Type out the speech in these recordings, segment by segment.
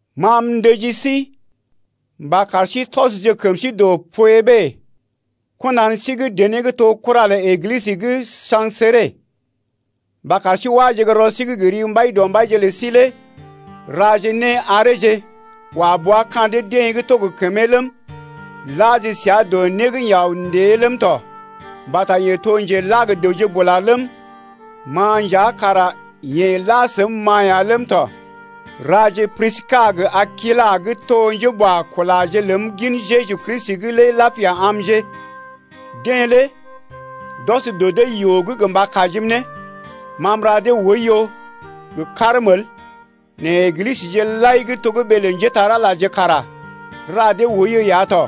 Ma m’ndəji sí mba kar sí tɔsje kəm sí dɔ Poebé, kɔnan sí gə́ dené gə́ to kura lə Eglisə gə́ Sa̰kre, mba kar sí wáje gə́ rɔ sí’g gə ri Mbaidɔmbaije lə sí lé raje né areeje wa bua ka̰ deḛ gə́ to kəmee ləm, laje səa dɔ né gə́ yeḛ aw ndée’g ləm tɔ, mbata yeḛ to njela gə dəwje bula ləm, ma nja kara yeḛ la səm-ma ya ləm tɔ. Raje Priska gə Akilas gə́ to njéboakulaje ləm gin Jeju Kristi’g lé lapia amje. Deḛ lé d’ɔs dɔ dee yoo’g gə mba kajim ne. Ma m’ra dee oiyo gə karm el nɛ Eglisəje lai gə́ to ɓee lə njépole-magəje kara ra dee oiyo ya tɔ.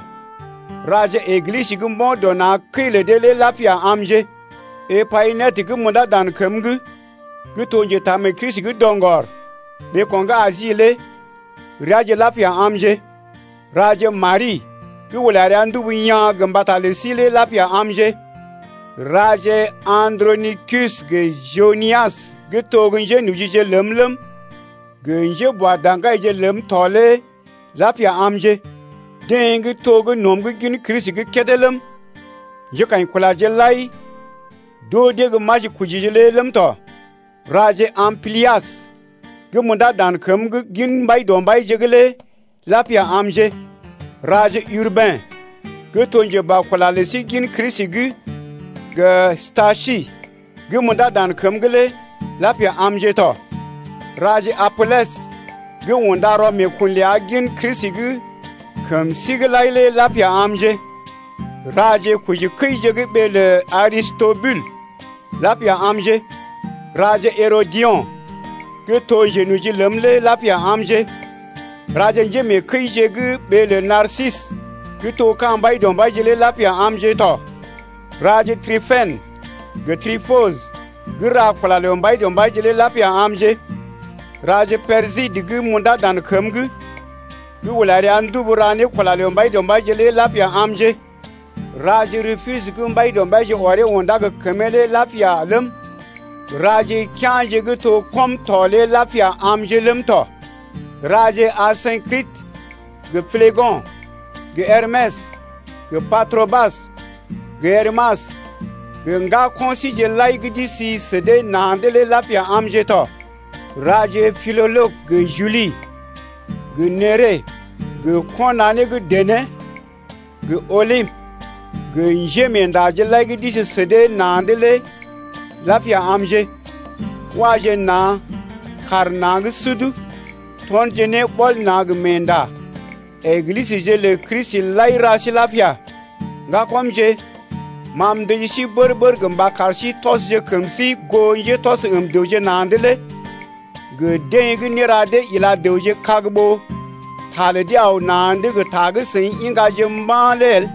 Raje Eglisə gə́ mbo̰ dɔ na̰ kəi lə dee lé lapia amje. Epayinètə gə́ m’undá dan kəm’g gə́ to njetaamee-Kristi gə́ doŋgɔr ɓeeko̰ gə́ Asi lé reaje lapia amje. Raje Mari gə́ ula rəa ndubu yaa̰ gə mbata lə sí lé lapia amje. Raje Andronikus gə Junias gə́ to njénojije ləm ləm, gə njéboada̰gaije ləm tɔ lé lapia amje. Deḛ gə́ to gə́ nɔm’g gin Kristi’g kédé ləm, njékaḭkulaje lai d’oo dee gə́ majikojije lé ləm tɔ. Raje Amplias gə́ m’undá dan kəm’g gin Mbaidɔmbaije’g lé lapia amje. Raje Urbɛn gə́ to njeboakula lə sí gin Kristi’g, gə Stakys gə́ m’undá dan kəm’g lé lapia amje tɔ. Raje Apelɛs gə́ unda rɔ meekun ləa gə́ gin Kristi’g kəm sí’g lai lé lapia amje. Raje kojikəije gə́ ɓee lə Aristobul lapia amje. Raje Herodio̰ gə́ to njenoji ləm lé lapia amje. Raje njémeekəije gə́ ɓee lə Narsisə gə́ to ka̰ Mbaidɔmbaije lé lapia amje tɔ. Raje Tripènə gə Triposə gə́ ra kula lə Mbaidɔmbaije lé lapia amje. Raje Persidə gə́ m’undá dan kəm’g gə́ ula rəa ndubu ra ne kula lə Mbaidɔmbaije lé lapia amje. Raje Rupus gə́ Mbaidɔmbaije ɔree undá gə kəmee lé lapia ləm, raje kea̰je gə́ to gə́ kɔm to lé lapia amje ləm tɔ. Raje Asynkritə gə Plego̰ gə Hermɛs gə Patrobas gə Hermas gə ŋgako̰ síje lai gə́ d’isi sə dee na̰’d lé lapia amje tɔ. Raje Pilologə gə Juli gə Nere gə kɔnanee gə́ dené gə Olimpə gə njémeendaje lai gə́ d’isi sə dee na̰’d lé lapia amje. Waje na̰ kaar na̰ gə́ sud tɔnje ne ɓɔl na̰ gə meenda. Eglisəje lə Kristi lai ra sí lapia. Ŋgakɔmje, ma m’ndəji sí bər-bər gə mba kar sí tɔsje kəm sí goo njétɔs əm dəwje na̰’d lé gə deḛ gə́ néra dee ila dəwje kag ɓó ta lə dee aw na̰’d gə ta gə́ seḭ iŋgaje mba̰ lé el.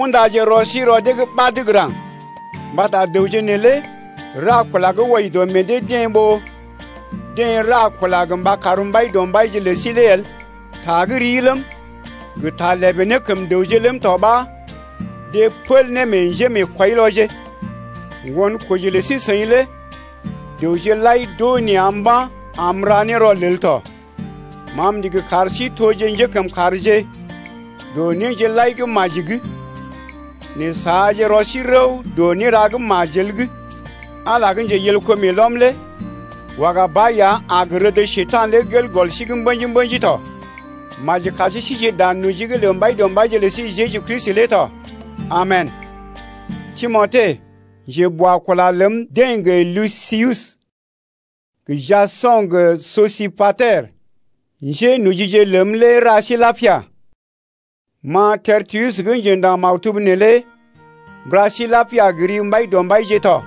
Undaje rɔ sí rɔ dee’g ɓad gə́ raŋg. Mbata dəwje neelé ra kula gə́ wɔji dɔ meḛ dee-deḛ ɓó deḛ ra kula gə mba kar Mbaidɔmbaije lə sí lé el. Ta gə́ rii ləm gə ta lèbè ne kəm dəwje ləm tɔ ɓa deḛ pəl ne meḛ njémeekwɔilɔje. Ŋgonkoji lə sí-seḭ lé dəwje lai d’oo nea̰ mba̰ am m’ra ne rɔlel tɔ. Ma m’ndigi kar sí toje njékəmkàrje dɔ néje lai gə́ maji’g nɛ saaje rɔ sí rəw dɔ néra gə́ majel’g. Ala gə́ njeyelko meelɔm lé waga ba ya a gə rəd Njekurai lé gel gɔl sí’g mbə̰ji-mbə̰ji tɔ. Maji kar sí sije dan noji’g lə Mbaidɔmbaije lə sí Jeju Kristi lé tɔ. Amen. Timote, njeboakula ləm, deḛ gə Lusius, gə Jaso̰ gə Sosipater, njénojije ləm lé ra sí lapia. Ma Tertius gə́ njendaŋ maktub neelé m’ra sí lapia gə ri Mbaidɔmbaije tɔ.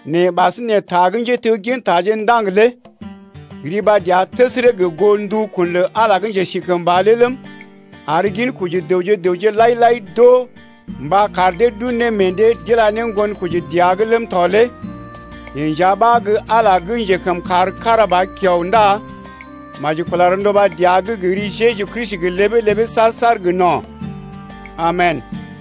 nɛ ɓasinè ta gə́ njéteggintaje ndaŋg lé riba dəa təsərə gə goo ndukun lə Ala gə́ njesikəmba lé ləm, ar ginkoji dəwje gə raŋg lai-lai d’oo mba kar dee d’un ne meḛ dee d’ila ne ŋgonkoji dəa’g ləm tɔ lé yeḛ nja ɓa gə́ Ala lé gə́ njekəmkàr kára ba kiao ndá maji kula rɔnduba dəa’g gə ri Jeju Kristi gə ləbee-ləbee saar-saar gə no̰. Amen!